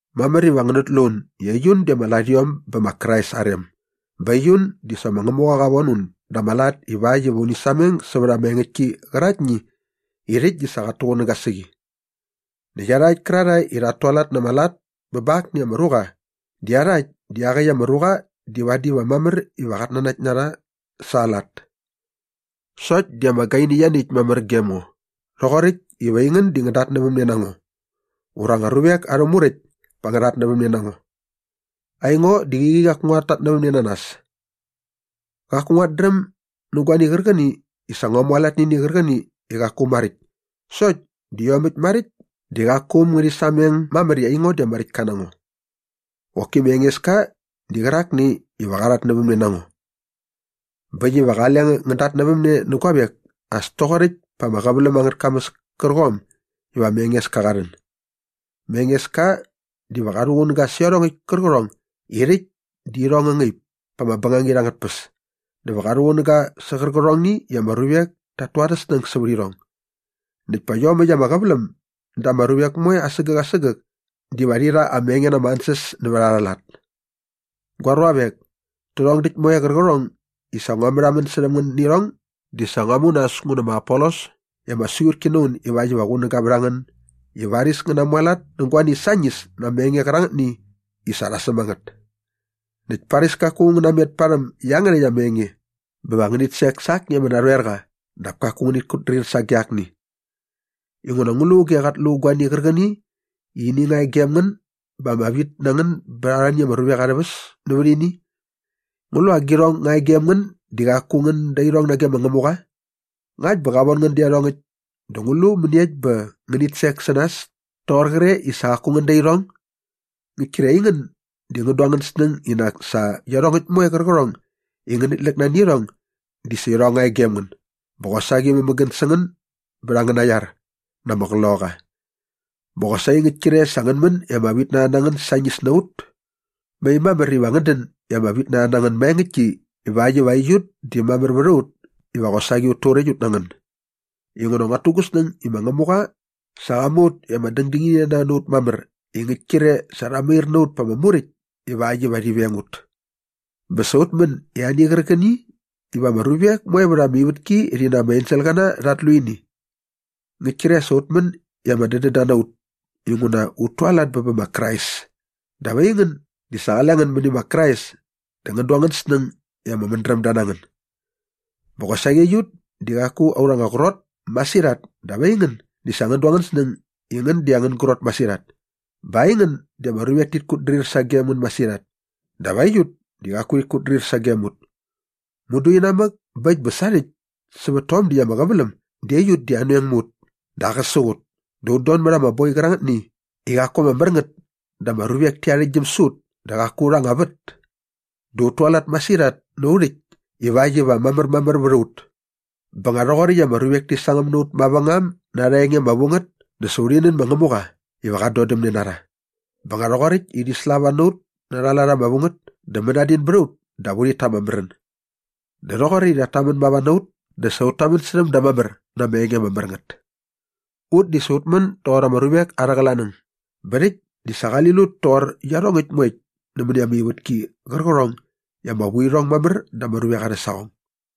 Mamär iva ngänät lu un i aiun di ama larhiom bä ma Krais aa rem bä aiun di sa ma Ngämuqa qa von un da ama lat ivakt iva uni sameng sävät ama engäktki qäraktni i rhäkt di sa qat tuqunäga sä qi. Näkt iarhakt kärarhae i rhat tualat na ama lat bä ba akni ama ruqa di iarhakt di iaqäkt ama ruqa di vadi va mamär iva qat nanakt na rha sa aa lat. Sokt di ama gaini ianiäkt mamär gem ngo rhoqoräkt iva aingän ngän datnävämne na ngo ura anga ruvek arhä muräkt pa ngä rhatnävämne na ngo. Aingo di qäqi qaku nguat tatnävämne na nas. Qaku nguat dräm nä guani qärqäni i sa ngua mualat nä ini qärqäni i qaku maräkt sokt di iomäkt maräkt di qaku äm ngärhi sameng mamär i aingo di ama räktka na ngo. Qoki ma Engeska di qärakni iva qa qa rhatnävämne na ngo. Bä äkt iva qale ngän datnävämne nä guavek as toqoräkt pa ama qäväläm angät kamäs kärqom iva ma Engeska qa rhän. Ma Engeska diva qa rhuqunäga sä iarhongäkt kärqärhong i rhäkt di irhong ngä ngaip pa ama bängangit angät tpäs dä va qa rhuqunäga sä qärqärhongni i ama ruvek tat tu arhä snäng sävät irhong. Näkt pät iomäkt ama qäväläm dä ama ruvek moe asägäk asägäk diva rhi rha ama enge na ama ansäs nävät aa lat. Gua ruavek, tärhong däkt moe qärqärhong i sa ngua märhamän särhäm ngän nä irhong di sa ngua mu nas ngu nä ma Apolos i ama siqutki na un ivakt iva qunäga vät a ngän i varis ngän namualat nä guani sañis na ama enge qärangätni i sa rha säm a ngät. Näkt paris kaku ngän natmet parhäm iangärhäkt ama enge bä va ngänit sek sa akni ama narhoerqa dap kaku ngänit kutdrir sage akni. Inguna ngu lu auge qat lu guani qärqäni i ini nga e gem ngän bä ama vit na ngän bät arhani ama ruvek arhä väs nävät ini? Ngu lu agirhong nga e gem ngän di qaku ngän da irhong nage ma Ngämuqa? Ngakt bä qa von ngän dä iarhongäkt dä ngu lu mäniekt bä va ngänit sek sä nas toqor qre i sa qaku ngän da irhong? Ngäkt kre aingän di ngän du angän snäng i nak sa iarhongäkt moe qärqärhong i ngänit läk nani irhong di sa irhong nga e gem ngän bä qosaqi mämägän sä ngän bät angäna iar na ama qloqaqa. Bä qosaqi ngäkt kre sa ngän män i ama vitnarha na ngän sañis na ut. Mai mamär iva ngän dän i ama vitnarha na ngän maengäktki ivakt iva aiut di mamär vät a ut iva qosaqi ut turäkt ut na ngän. Inguna nguat tu gu snäng i ma Ngämuqa sa qa mu ut i ama dängdängininarha na ut mamär i ngäkt kre sa rha mair na ut pa ama muräkt ivakt iva rhi veng ut. Bä sa ut män i ani qärqäni iva ama ruvek moe vät ama ivätki rhi na ama enselqäna rhat lu ini. Ngäkt kre sa ut män i ama dädända na ut inguna ut tualat bä bä ma Krais dap aingän di sa qale ngän mäni ma Krais dä ngän du angän snäng i ama mädrämda na ngän. Bä qosaqi aiut di qaku aurha anga qrot masirhat dap aingän di sa ngän du angän snäng i ngän di angän grot masirhat. Bä aingän di ama ruvek tit kutdrir sagem ngän masirhat dap aiut di qaku rhit kutdrir sagem ut. Mudu inamäk bä äkt bä sarhäkt sävät tom däkt ama qäväläm di aiut di anoeng mä ut dä aqäsäk ut dä ut don mät ama boi qärangätni i qaku ama mär ngät dä ama ruvek ti arhäktgyäm sä ut dä qaku aurha anga vät dä ut tualat masirhat na au rhäkt ivakt iva mamärmamär vät a ut. Bä nga rhoqoräkt i ama ruvek ti sangäm na ut mavängam na arha enge ama vu ngät dä sa urhi nän ma Ngämuqa iva qat dodämne na rha. Bä nga rhoqoräkt i rhi slava na ut na arha lat ama vu ngät dä mänadin bät a ut dap urhit ta ama märän. Dä rhoqoräkt i rhat tamän mava na ut dä sa ut tamän särhäm da mamär na ama enge ama mär ngät. Ut di sa ut män doqor ama ruvek arhä qlanäng bä rhäkt di sa qali lut toqor iarhongäkt moekt nämäni ama ivätki qärqärhong i ama vu irhong mamär da ama ruvek arhä saqong.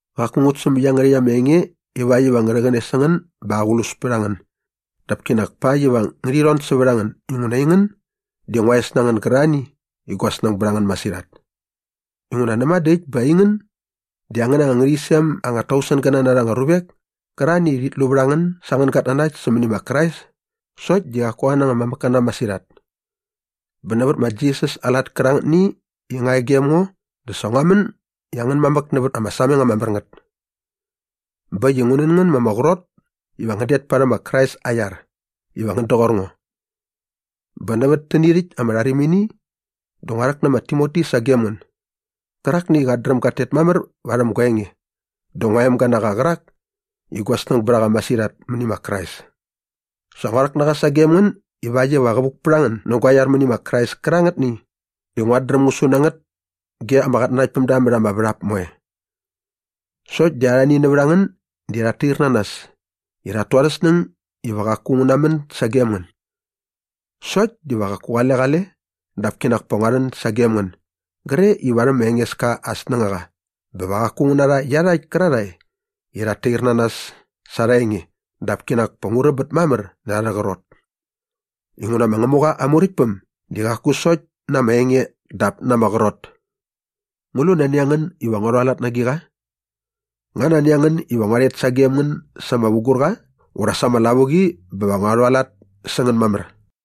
Qaku ngut säm iangärhäkt ama enge ivakt iva ngä rhäqäne sä ngän bä aqlus pät a ngän dap kinak pakt iva ngärhi rhon sävät a ngän inguna aingän di ngua es na ngän gärarhani i gua snäng bät a ngän masirhat. Inguna näma dä äkt bä aingän di angän anga ngärhäqyisem anga tausengäna na anga ruvek kärarhani i rhit lu vät a ngän sa angän gatnanakt sämäni ma Krais sokt di qaku angän anga mamäkkäna masirhat. Bä nävät ma Jisas aa lat kärangätni i nga e gem ngo dä sa ngua män i angän mamäk nävät ama sameng ama mär ngät. Bä äkt i ngu nän ngän ma ama qrot iva ngän det parhäm ma Krais aa iar iva ngän doqor ngo. Bä nävät täni rhäkt ama rharimini dä ngua rhäk nä ma Timoti sagem ngän gärakni i qat dräm gat tet mamär varhäm gua enge dä ngua emga na qa qärak i gua snäng bät a qa masirhat mäni ma Krais. Sa ngua rhäk na qa sagem ngän ivakt iva qä vuk pät a ngän nä gua iar mäni ma Krais kärangätni i nguat dräm ngu su na ngät ge ama qatnanaktpämda mät ama värhap moe. Sokt di arhani nävät a ngän di rhat tair na nas i rhat tu arhä snäng iva qaku ngu namän sagem ngän. Sokt di va qaku qale qale dap kinak pa ngua rhet sagem ngän gre i varhäm ma Engeska aa snängaqa bä va qaku ngu narha iarhakt kärarhae i rhat tair na nas sa arha enge dap kinak pa ngu räbät mamär närha arhä qrot. Inguna ma Ngämuqa aa Muräktpäm di qaku sokt na ama enge dap na ama qrot. Ngu lu nani a ngän iva ngua rhualat na agiqa? Nga nani a ngän iva ngua rhet sagem ngän sa ama vugurqa ura sa ama lavuqi bä va ngua rhualat sä ngän mamär?